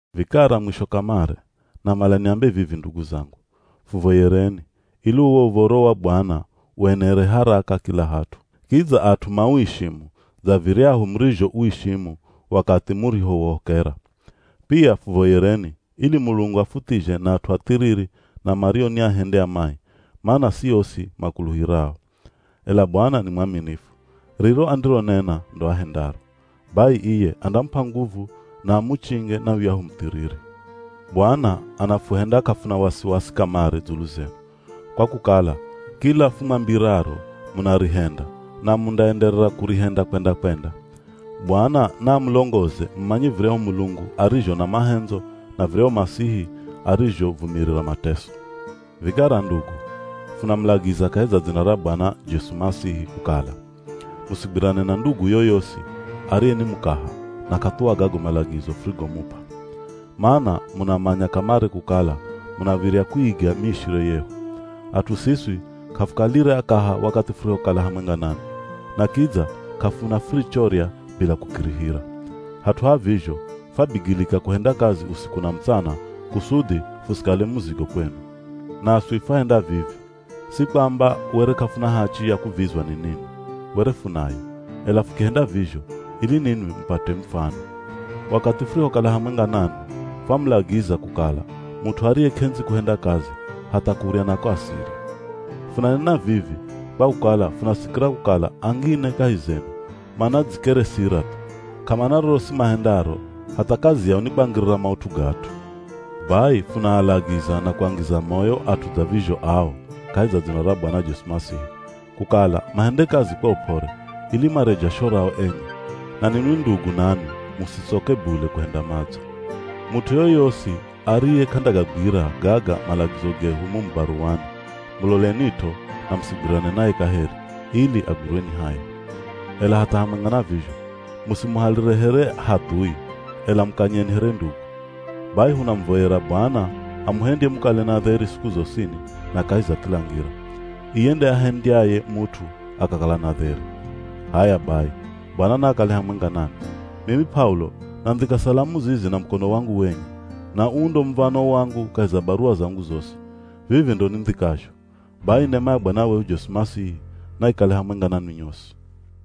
Vikara mwisho kamare, namala niambe vivi ndugu zangu, fuvoyereni, ili uwo Uv̱oro wa Bwana uenere haraka kila hat'u. Kidza at'u mauishimu dza viryahu murizhouishimu wakathi murihouhokera. Pia fuvoyereni, ili Mulungu afuthizhe na at'u athiriri na mario ni ahendi a mai, mana si osi makuluhirao. Ela Bwana ni mwaminifu, riro andironena ndo ahendaro. Bai iye andamup'a nguvu na amuchinge na yuyahu muthiriri. Bwana anafuhenda k'afuna wasiwasi kamare dzulu zenu, kwa kukala kila fumwambiraro munarihenda, na mundaenderera kurihenda kwenda-kwenda. Bwana naamulongoze mumanye viryahu Mulungu arizho na mahendzo na viryahu Masihi arizhovumirira mateso. Vikara ndugu, funamulagiza kahi za dzina ra Bwana Jesu Masihi kukala: Musigwirane na ndugu yoyosi ariye ni mukaha na k'athuwa gago malagizo furigomup'a. Mana munamanya kamare kukala munav̱irya kuiga miishire yehu. At'u siswi k'afukalire akaha wakathi furihokala hamwenga nanwi. Na kidza k'afuna furichorya bila kukirihira. Hat'u ha vizho, fwabigilika kuhenda kazi usiku na mutsana kusudhi fusikale muzigo kwenu. Naswi fwahenda vivi, si kwamba were k'afuna hachi ya kuvizwa ni ninwi, were funayo, ela fukihenda vizho ili ninwi mupate mufano. Wakathi furihokala hamwenga nanwi fwamulagiza kukala mut'u ariye k'endzi kuhenda kazi, hatha kurya nako asirye. Funanena vivi, kwa kukala funasikira kukala angine kahi zenu manadzikeresira thu. K'amana rorosi mahendaro, hatha kazi yao ni kwangirira maut'u ga at'u. Bai funaalagiza na kuangiza moyo at'u dza vizho ao kahi za dzina ra Bwana Jesu Masihi, kukala mahende kazi kwa up'ore ili marye jasho rao enye. Na ninwi ndugu nanwi, musitsoke bule kuhenda madzo. Mut'u yoyosi ariye k'andagagwira gaga malagizo gehu mumu baruwani, mulolenit'o na musigwirane naye kaheri, ili agwirwe ni haya. Ela hatha hamwenga na vizho, musimuhalire here hadhui, ela mukanyeni here ndugu. Bai hunamuvoyera Bwana amuhendye mukale na dheri siku zosini na kahi za kila ngira. Iye nde ahendyaye mut'u akakala na dheri. H'aya bai, Bwana naakale hamwenga nanwi. Mimi P'aulo nandhika salamu zizi na mukono wangu wenye. Na uu ndo muv̱ano wangu kahi za baruwa zangu zosi. Vivi ndo nindhikazho. Bai nema ya Bwana wehu Jesu Masihi, naikale hamwenga nanwi nyosi.